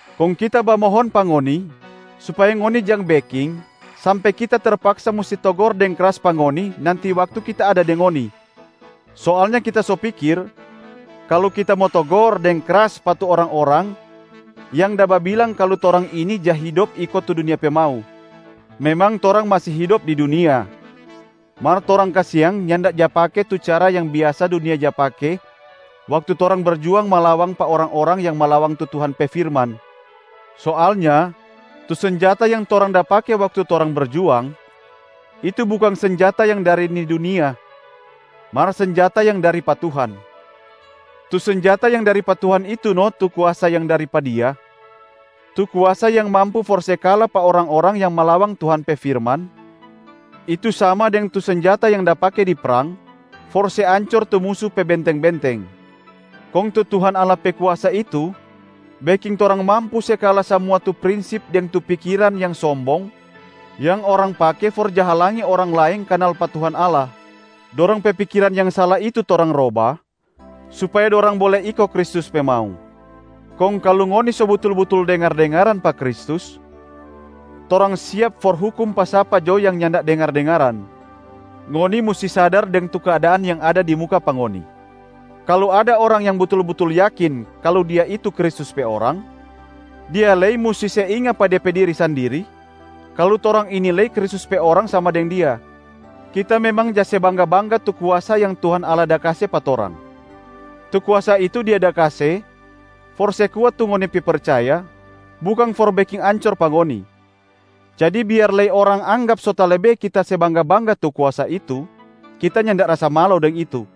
kong kita bamohon pa ngoni supaya ngoni jang beking sampe kita terpaksa musti togor deng kras pa ngoni nanti waktu kita ada deng ngoni. Soalnya kita so pikir kalu kita mo togor deng kras pa tu orang-orang yang da babilang kalu torang ini ja hidop iko tu dunia pe mau. Memang torang masi hidop di dunia, mar torang kasiang nyanda da pake tu cara yang biasa dunia ja pake waktu torang berjuang malawang pa orang-orang yang malawang tu Tuhan pe firman. Soalnya tu senjata yang torang da pake waktu torang berjuang, itu bukang senjata yang dari ni dunia mar senjata yang dari pa Tuhan. Tu senjata yang dari pa Tuhan itu no tu kuasa yang dari pa Dia, tu kuasa yang mampu for se kala pa orang-orang yang malawang Tuhan pe firman, itu sama deng tu senjata yang da pake di prang for se ancor tu musu pe benteng-benteng. Kong tu Tuhan Allah pe kuasa itu beking torang mampu se kala samua tu prinsip deng tu pikiran yang sombong yang orang pake for ja halangi orang laeng kanal pa Tuhan Allah. Dorang pe pikiran yang sala itu torang roba supaya dorang bole iko Kristus pe mau. Kong kalu ngoni so butul-butul dengar-dengaran pa Kristus, torang siap for hukum pa sapa jo yang nyanda dengar-dengaran. Ngoni musti sadar deng tu keadaan yang ada di muka pa ngoni. Kalu ada orang yang butul-butul yakin kalu dia itu Kristus pe orang, dia lei musti se inga pa de pe diri sandiri kalu torang ini lei Kristus pe orang sama deng dia. Kita memang ja se bangga-bangga tu kuasa yang Tuhan Allah da kase pa torang. Tu kuasa itu Dia da kase for se kuat tu ngoni pe percaya, bukang for beking ancor pa ngoni. Jadi biar lei orang anggap so talebe kita se bangga-bangga tu kuasa itu, kita nyanda rasa malo deng itu.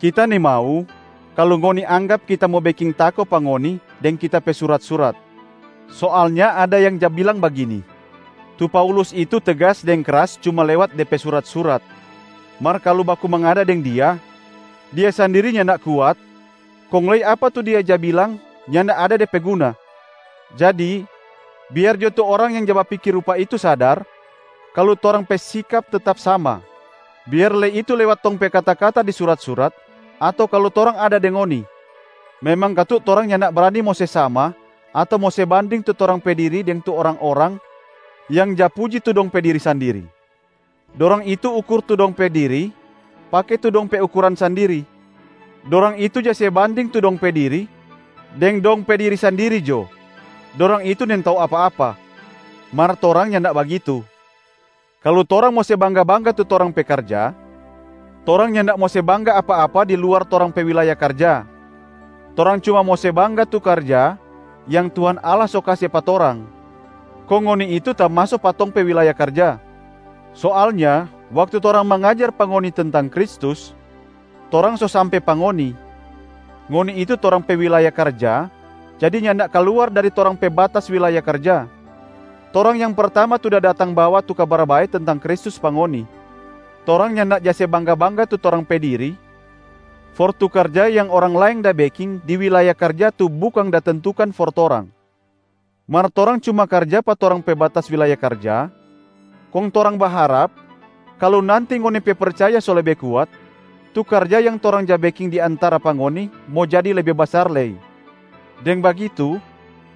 Kita nimau kalu ngoni anggap kita mo beking tako pa ngoni deng kita pe surat-surat. Soalnya ada yang ja bilang bagini, “Tu Paulus itu tegas deng kras cuma lewat de pe surat-surat, mar kalu baku mangada deng dia, dia sandiri nyanda kuat kong lei apa tu dia ja bilang nyanda ada de pe guna.” Jadi biar jo tu orang yang ja bapikir rupa itu sadar kalu torang pe sikap tetap sama, biar lei itu lewat tong pe kata-kata di surat-surat ato kalu torang ada deng ngoni. Memang katu torang nyanda brani mo se sama ato mo se banding tu torang pe diri deng tu orang-orang yang ja puji tu dong pe diri sandiri. Dorang itu ukur tu dong pe diri pake tu dong pe ukuran sandiri. Dorang itu ja se banding tu dong pe diri deng dong pe diri sandiri jo. Dorang itu nintau apa-apa! Mar torang nyanda bagitu. Kalu torang mo se bangga-bangga tu torang pe karja, torang nyanda mo se bangga apa-apa di luar torang pe wilaya karja. Torang cuma mo se bangga tu karja yang Tuhan Allah so kase pa torang, kong ngoni itu tamaso pa tong pe wilaya karja. Soalnya waktu torang mangajar pa ngoni tentang Kristus, torang so sampe pa ngoni, ngoni itu torang pe wilaya karja jadi nyanda kaluar dari torang pe batas wilaya karja. Torang yang pertama tu da datang bawa tu Kabar Bae tentang Kristus pa ngoni. Torang nyanda ja se bangga-bangga tu torang pe diri for tu karja yang orang laeng da beking di wilaya karja tu bukang da tentukan for torang. Mar torang cuma karja pa torang pe batas wilaya karja, kong torang baharap kalu nanti ngoni pe percaya so lebe kuat, tu karja yang torang ja beking di antara pa ngoni mo jadi lebe basar lei. Deng bagitu,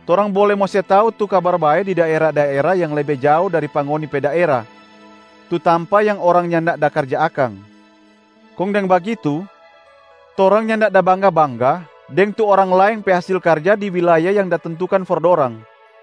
torang bole mo se tau tu Kabar Bae di daera-daera yang lebe jao dari pa ngoni pe daera, tu tampa yang orang nyanda da karja akang. Kong deng bagitu, torang nyanda da bangga-bangga deng tu orang laeng pe hasil karja di wilaya yang da tentukan for dorang.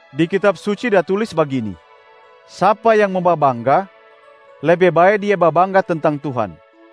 Di Kitab Suci da tulis bagini, “Sapa yang mo babangga, lebe bae dia babangga tentang Tuhan”.